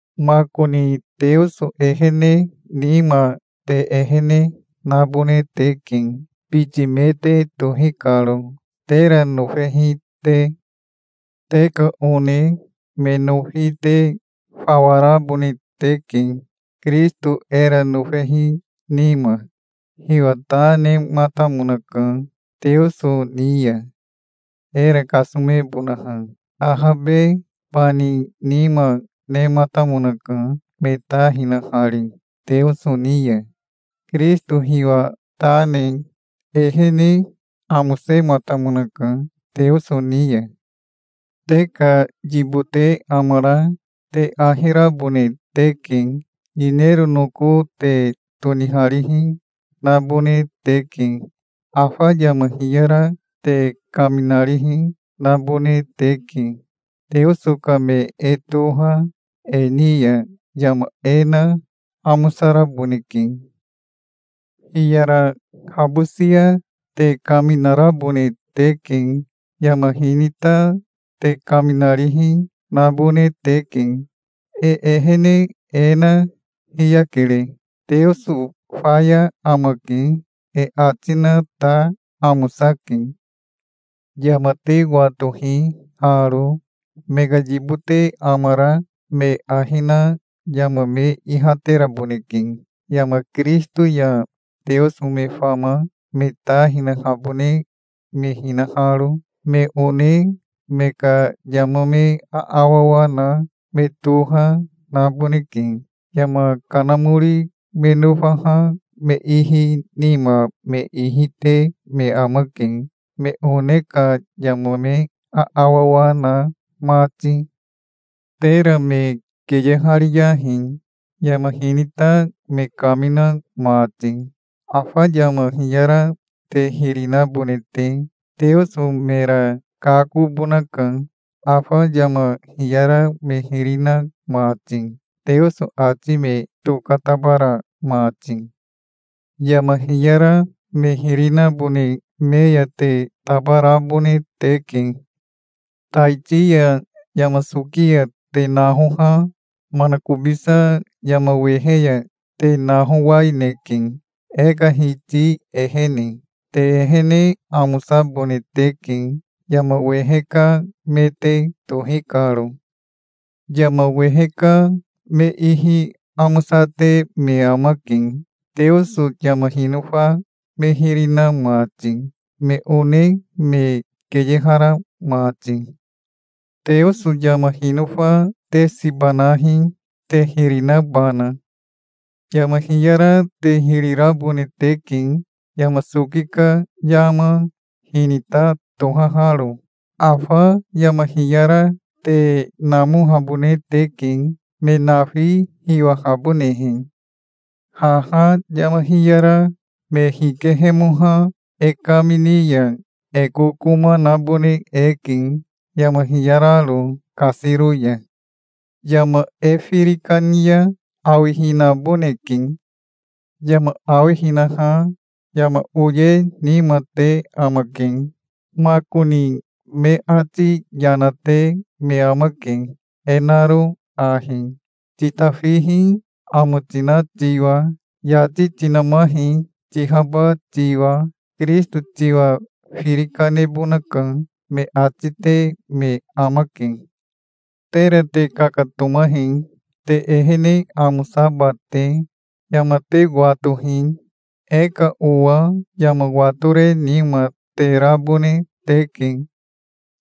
Makoni Teoso ehene nima te ehene nabone teke, biti me te tohi karo, tera nofehi te. Te ka one me nofi te fawa rabone teke, Kirisito era nofehi nima. Hiwa ta nematamonaka Teoso ni ya, era kasomebonaha. Ahabe bani nima nematamonaka, me ta hinahari Teoso ni ya. Kirisito hiwa ta ne ehene amosematamonaka Teoso ni ya. Te ka yibote amara te ahi rabone teke. Yinero noko te toniharihi nabone teke. Afa yama hiyara te kaminarihi nabone teke. Teoso ka me e toha e ni ya yama e na amosaraboneke. Hiyara habosia te kaminarabone teke. Yama hinita te kaminarihi nabone teke. E ehene e na hiyakere. "Teoso faya amake", e ati na ta amosake. Yama te watohi haro: Me ka yibote amara me ahi na yama me ihateraboneke, yama Kirisito ya Teoso me fama me ta hinahabone me hinaharo. Me one me ka yama me aawawa na, me toha naboneke. Yama kanamori me nofaha me ihi nima me ihi te me amake, me one ka yama me aawawa na mati. Tera me keyehariyahi, yama hinita me kamina mati, afa yama hiyara te hiri nabone te. Teoso mera kakobonaka, afa yama hiyara me hiri na mati, Teoso ati me tokatabara mati. Yama hiyara me hiri nabone me ya te tabarabone teke. Taiti ya yama soki ya te nahoha manakobisa yama wehe ya te nahowaineke, e ka Hiti ehene. Te ehene amosabone teke, yama wehe ka me te tohi karo. Yama wehe ka me ihi amosate me amake, Teoso yama hinofa me hiri na mati, me one me keyehara mati. Teoso yama hinofa te siba nahi, te hiri nabana. Yama hiyara te hiri rabone teke, yama soki ka yama, hinita tohaharo. Afa yama hiyara te namohabone teke, me nafi hiwahabonehe. Haha yama hiyara me hikehemoha e kamini ya e kokoma nabone eke, yama hiyararo kasiro ya. Yama e firi kani ya awihinaboneke. Yama awihinaha yama oye nima te amake. Makoni me ati yana te me amake, e naro ahi: "Titafihi, amo tina tiwa. Yati tinamahi, tihaba tiwa. Kirisito tiwa firi kanebonaka", me ati te me amake. Tera te kakatomahi, te ehene amosaba te. Yama te watohi. E ka owa yama watore nima te rabone teke.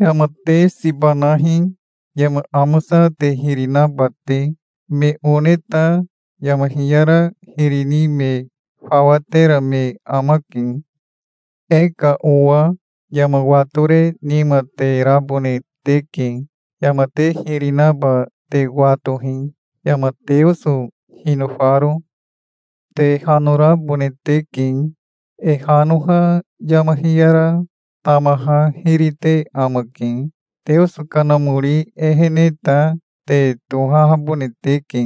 Yama te siba nahi, yama amosa te hiri naba te. Me one ta yama hiyara hiri ni me fawa tera me amake. E ka owa yama watore nima te rabone teke. Yama te hiri naba te watohi, yama Teoso hinofaro. Te hanorabone teke. E hanoha yama hiyara tamaha hiri te amake. Teoso Kanamori ehene ta te tohahabone teke,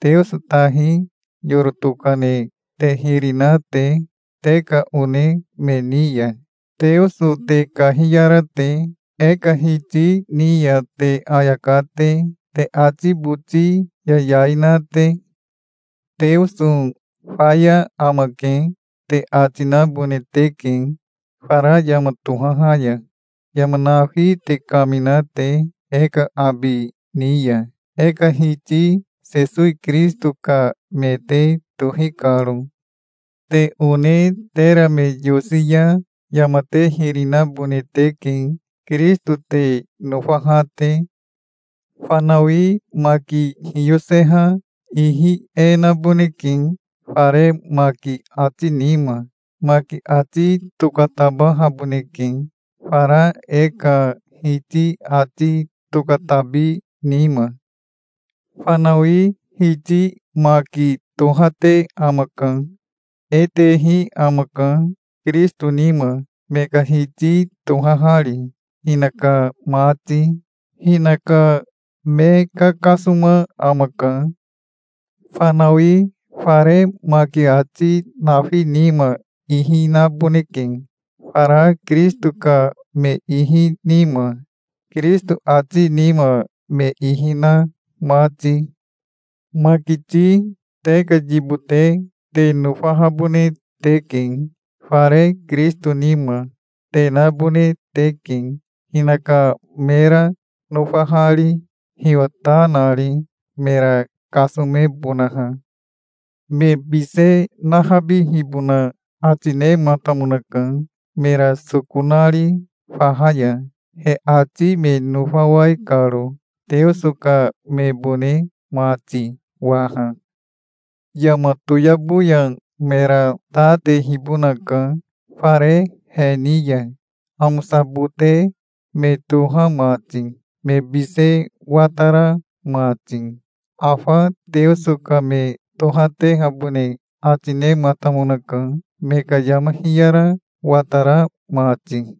Teoso tahi yoro tokane te hiri na te te ka one me ni ya, Teoso te kahiyara te, e ka Hiti ni ya te ayaka te, te ati boti yayai na te. "Teoso faya amake", te ati nabone teke, fara yama tohaha ya, yama nafi te kamina te e ka abi ni ya, e ka Hiti Sesowi Kirisito ka me te tohi karo. Te one tera me yosi ya yama te hiri nabone teke, Kirisito te nofaha te. Fanawi maki hiyoseha ihi e naboneke fare maki ati nima. Maki ati tokatabahaboneke, fara e ka Hiti ati tokatabi nima. Fanawi hiti maki tohate amaka. E tehi amaka, Kirisito nima, me ka Hiti tohahari, hinaka mati. Hinaka me kakasoma amaka. Fanawi fare maki ati nafi nima ihi naboneke, fara Kirisito ka me ihi nima, Kirisito ati nima me ihi na mati. Makiti te ka yibote te nofahabone teke. Fare Kirisito nima te nabone teke, hinaka mera nofahari, hiwa ta nari, mera kasomebonaha. Me bise nahabihibona ati nematamonaka, mera soko nari faha ya, he ati me nofawai karo, Teoso ka mebone mati waha. Yama toyabo ya mera ta tehibonaka fare he ni ya, amosabote me toha mati, me bise watara mati. Afa Teoso ka me tohatehabone ati nematamonaka, me ka yama hiyara watara mati.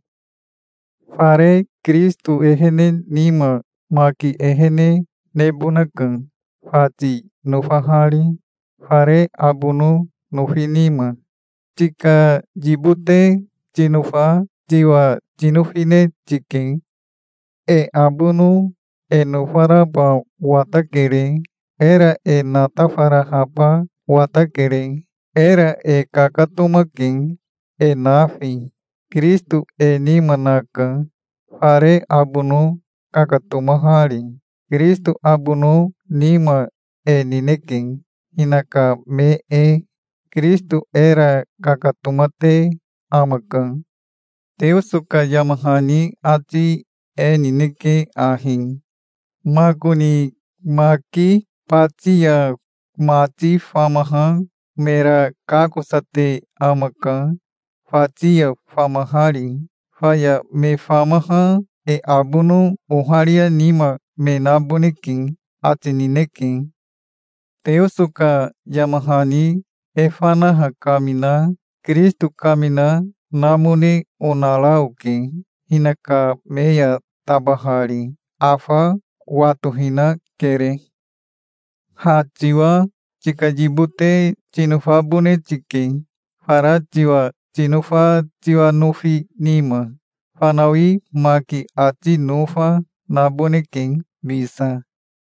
Fare Kirisito ehene nima maki ehene nebonaka, fati nofahari, fare abono nofi nima. Tika yibote tinofa tiwa tinofine tike. E abono e nofaraba watakere. Era e natafarahaba watakere. Era e kakatomake, e nafi. Kirisito e nima naka fare abono kakatomahari. Kirisito abono nima e nineke, hinaka me e. Kirisito era kakatomate amaka. Teoso ka yama hani ati e nineke ahi: "Makoni maki bati ya mati famaha mera kakosate amaka, fati ya famahari. Faya me famaha e abono oharia nima me naboneke", ati nineke. Teoso ka yama hani e fanaha kamina Kirisito kamina namone onara oke, hinaka me ya tabahari. Afa watohinakere. Ha tiwa tika yibote tinofabone tike, fara tiwa tinofa tiwa nofi nima. Fanawi maki ati nofa naboneke bisa.